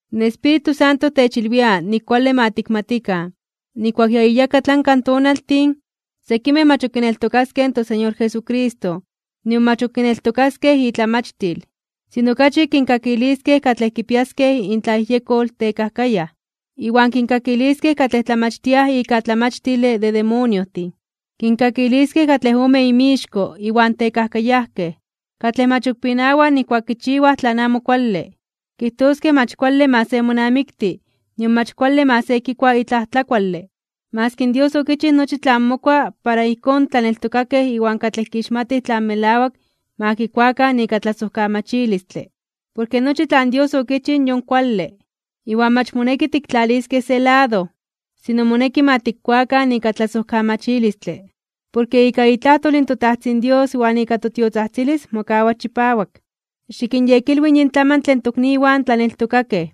In Espíritu Santo techilwia nik kuale ma tikmatikan, nijkuak ya iyakatlanka in tonaltin, sekimej mach ok kineltokaskej toSeñor Jesucristo nion mach ok kineltokaskej itlamachtil. Sino okachi kinkakiliskej katlej kipiaskej intlayejyekol tekajkayaj, iwan kinkakiliskej katlej tlamachtiaj ika tlamachtile de demoniojtin. Kinkakiliskej katlej ome inmixko iwan tekajkayajkej, katlej mach ok pinawaj nijkuak kichiwaj tlan amo kuale. Kijtoskej mach kuale ma se monamikti nion mach kuale ma se kikua itlaj tlakuale, maski Dios okichij nochi tlan mokua para ijkón in tlaneltokakej iwan katlej kixmatij tlan melawak ma kikuakan ika tlasojkamachilistle. Porke nochi tlan Dios okichij yon kuale, iwan mach moneki tiktlaliskej se lado. Sino moneki ma tikkuakan ika tlasojkamachilistle. Porke ika itlajtol in toTajtzin Dios iwan ika totiotzajtzilis mokawa chipawak. Xikinyekilwi yin tlamantle in tokniwan tlaneltokakej,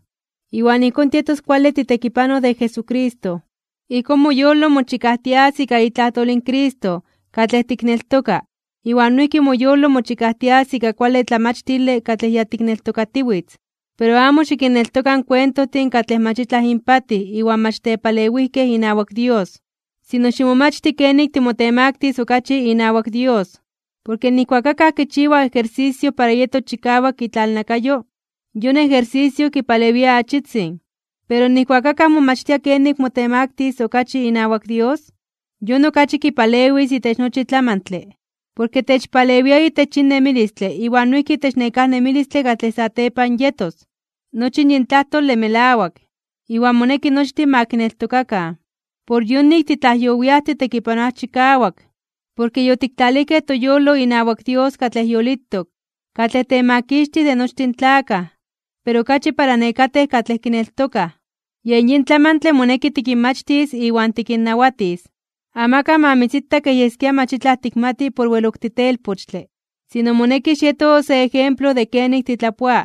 iwan ijkón tietos kuale titekipanoj de Jesucristo. Ijkón moyolo mochikajtias ika itlajtol in Cristo katlej tikneltoka iwan noijki moyolo mochikajtias ika kuale tlamachtile katlej ya tikneltokatiwitz. Pero amo xikinneltoka in kuentojtin katlej mach itlaj inpatij iwan mach tepalewijkej inawak Dios. Sino ximomachti kenik timotemaktis (timotemaktilis) okachi inawak Dios. Porke nijkuak akaj kichiwa ejersisio para yetos chikawak itlalnakayo, yon ejersisio kipalewia achitzin, pero nijkuak akaj momachtia kenik motemaktis okachi inawak Dios, yon okachi kipalewis itech nochi tlamantle. Porke techpalewia itech yin nemilistle iwan noijki itech nekáj nemilistle katlej satepan yetos. Nochi yin tlajtole melawak, iwan moneki nochtin ma kineltokakan. Por yonik titlajyowiaj titekipanoaj chikawak, porke yotiktlalijkej toyolo inawak Dios katlej yolitok, katlej Temakixtij de nochtin tlakaj, pero okachi para nekatej katlej kineltokaj. Yen yin tlamantle moneki tikinmachtis iwan tikinnawatis. Amakaj ma mitzita kej yeskia mach itlaj tikmati por wel ok titelpochtle. Sino moneki xieto se ejemplo de kenik titlapoa,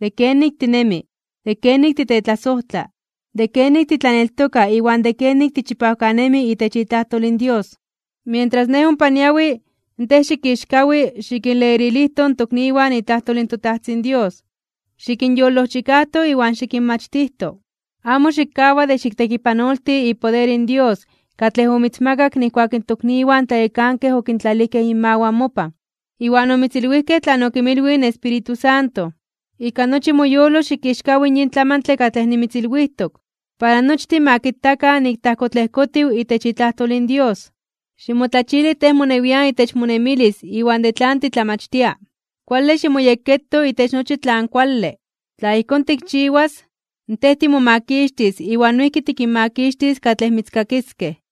de kenik tinemi, de kenik titetlasojtla, de kenik titlaneltoka iwan de kenik tichipawkanemi itech itlajtol in Dios. Mientras nej ompa niawi, tej xikixkawi (ximomeli) xikinlerilijto in tokniwan itlajtol in toTajtzin Dios, xikinyolojchikajto iwan xikinmachtijto. Amo xikkawa de xiktekipanolti ipoder in Dios katlej omitzmakak nijkuak in tokniwan tlayekankej okintlalijkej inmawan mopan, iwan omitzilwijkej tlan okinmilwij in Espíritu Santo. Ika nochi moyolo xikixkawi (ximomeli) yin tlamantle katlej nimitzilwijtok, para nochtin ma kitakan nik tajkotlejkotiw itech itlajtol in Dios. Ximotlachili tej monewian itech monemilis iwan de tlan titlamachtia. Kuale ximoyekketo itech nochi tlan kuale. Tla ijkón tikchiwas, tej timomakixtis iwan noijki tikinmakixtis katlej mitzkakiskej.